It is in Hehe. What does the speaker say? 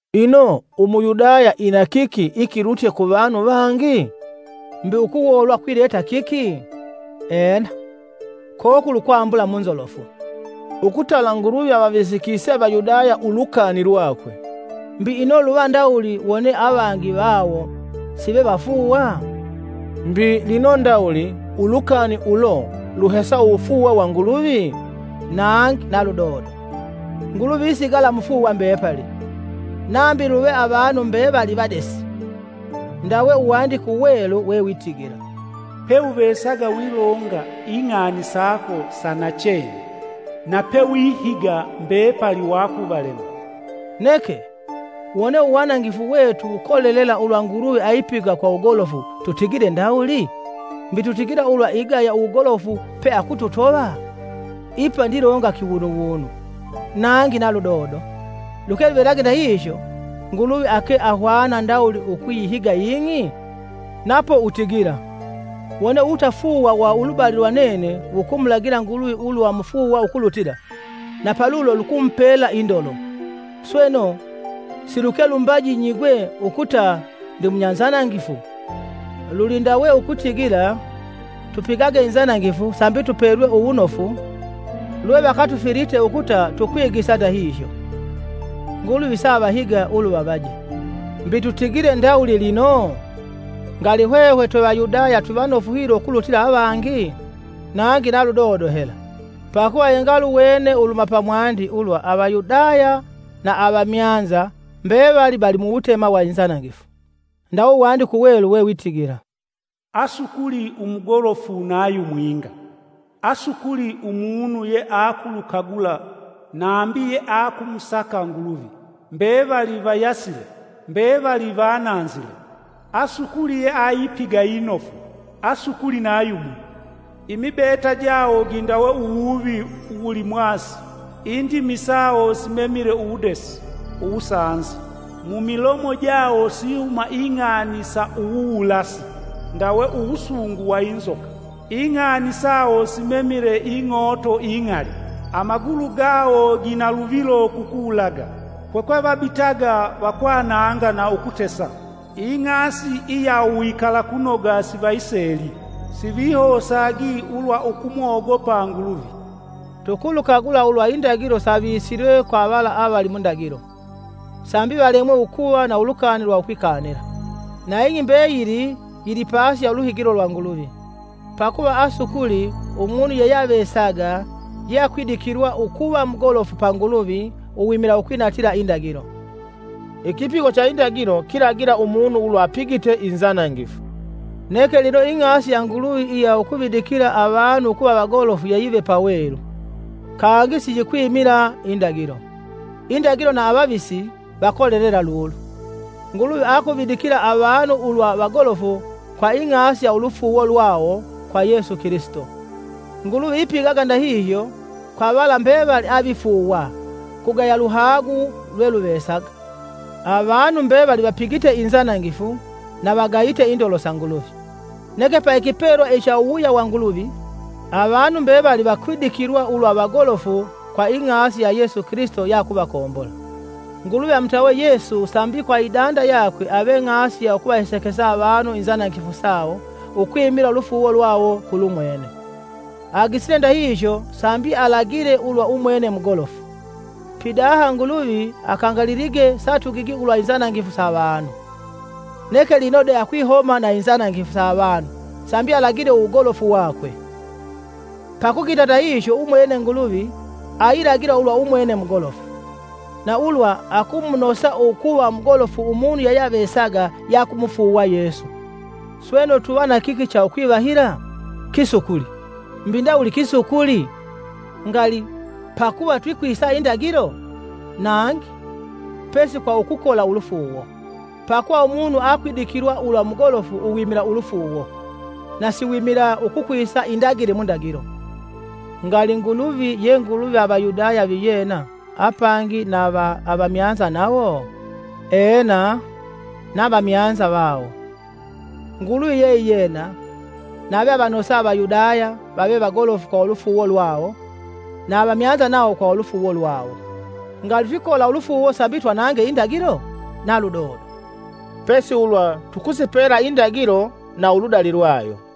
Ino, Umuyudaya inakiki ikilutye kuvanu vangi? Mbi ukuwoolwa kwileta kiki? Ena, kokuli ukwambula mu nzolofu, ukutala Nguluvi avavisikise Avayudaya ulukani lwakwe. Mbi ino luva ndawuli wone avangi vawo sivevafuuwa? Mbi lino ndawuli ulukani ulo luhesa uwufuuwa wa Nguluvi? Nangi na ludodo! Nguluvi isigala mufuuwa mbepali, nambi luve avanu mbevali vadesi. Ndawe uwandike uwelu wewitigila, “Peuvesaga wilonga, ing'ani sako sa nachene na pewihiga mbepali wakuvalema.” Neke, wone uwanangifu wetu wukolelela ulwa Nguluvi aipiga kwa wugolofu, tutigile ndawuli? Mbi tutigila ulwa igaya uwugolofu pe akututova? (Ipa ndilonga kiwunuwunu.) Nangi na ludodo! Luke luvelage ndahihyo, Nguluvi ake ahwana ndawuli ukuyihiga ing'i? Napo utigila, “Wone uwutafuuwa wa ulubali lwa nene wukumulagila Nguluvi ulwa mufuuwa ukulutila, na palulo lukumupela indolo, sweno siluke lumbaji nyigwe ukuta ndimunyanzanangifu.!” Luli ndawe ukutigila tupigage inzanangifu sambi tupelwe uwunofu lwe vakatufilite ukuta tukwigisa ndahihyo. Nguluvi saavahiga uluvavaje. Mbi tutigile ndawuli lino? Ngali hwehwe twe Vayudaya twivanofu hilo ukulutila avangi? Nangi na ludodo hela! Pakuva yengaluwene uluhuma pamwandi ulwa Avayudaya na avamyanza mbevali vali muwutema wa inzanangifu. Ndawe Uwandike Uwelu wewitigila: “Asukuli umugolofu na yumwinga! Asukuli umunu yeakulukagula nave yeakumusaka Nguluvi. Mbevali vayasile, mbevali vananzile; Asukuli yeaipiga inofu, asukuli na yumwi. Imibeta jawo gindawe uwuvi uwulimwasi, indimi sawo simemile uwudesi (uwusanzi) Mumilomo jawo sihuma ing'ani sa uwuwulasi ndawe uwusungu wa inzoka. Ing'ani sawo simemile ing'ooto ing'ali. Amagulu gawo ginaluvilo kukuwulaga, kukwevabitaga vakwananga na ukutesa. Ing'asi iya uwikalakunoga sivayiseli, sivihosagi ulwa ukumogopa Nguluvi.” Tukulukagula ulwa indagilo savisilwe kwa vala avali mundagilo, sambi valemwe ukuva na ulukani lwa ukwikanila. Na ing'i mbeyili yili pasi ya uluhigilo lwa Nguluvi. Pakuva asukuli umunu yeyeavesaga yeakwidikilwa ukuva mugolofu pa Nguluvi uwimila ukwinatila indagilo; ikipigo cha indagilo kilagila umunu ulwa apigite inzanangifu. Neke lino ing'asi ya Nguluvi iya ukuvidikila avanu ukuva vagolofu yeyive pawelu, kangi siyikwimila indagilo. Indagilo na avavisi vakolelela lulu. Nguluvi akuvidikila avanu ulwa vagolofu kwa ing'asi ya ulufuuwo lwawo kwa Yesu Kilisito; Nguluvi ipigaga ndahihyo kwa vala mbevali avifuuwa; kugaya luhagu lweluvesaga. Avanu mbevali vapigite inzanangifu na vagayite indolo sa Nguluvi. Neke pa ikipelwa icha uwuwuya wa Nguluvi, avanu mbevali vakwidikilwa ulwa vagolofu kwa ing'asi ya Yesu Kilisito yeakuvakombola. Nguluvi amutawe Yesu sambi kwa idanda yakwe ave ng'asi ya ukuvahesekesa avanu inzanangifu sawo ukwimila ulufuuwo lwawo kulumwene. Agisile ndahihyo sambi alagile ulwa umwene mugolofu. Pidaha Nguluvi akangalilige satugigi ulwa inzanangifu sa avanu; Neke lino de akwihoma na inzanangifu sa avanu sambi alagile uwugolofu wakwe. Pakugita ndahihyo umwene Nguluvi ailagila ulwa umwene mugolofu, na ulwa akumunosa ukuva mugolofu umunu yeyeavesaga yeakumufuuwa Yesu. Sweno tuva na kiki cha ukwivahila? Kisukuli! Mbi ndawuli kisukuli? Ngali! Pakuva twikwisa indagilo? Nangi! pesi kwa ukukola ulufuuwo. Pakuva umunu akwidikilwa ulwa mugolofu uwimila ulufuuwo, na siwimila ukukwisa indagile mu ndagilo. Ngali Nguluvi ye Nguluvi va Avayudaya viyena apangi na va avamyanza nawo? Ena na vamyanza vawo. Nguluvi yeiyena, nave avanosa Avayudaya vave vagolofu kwa ulufuuwo lwawo na avamyanza nawo kwa ulufuuwo lwawo. Ngali twikola ulufuuwo sambi twanange indagilo? Na ludodo; pesi ulwa tukusipela indagilo na uludali lwayo.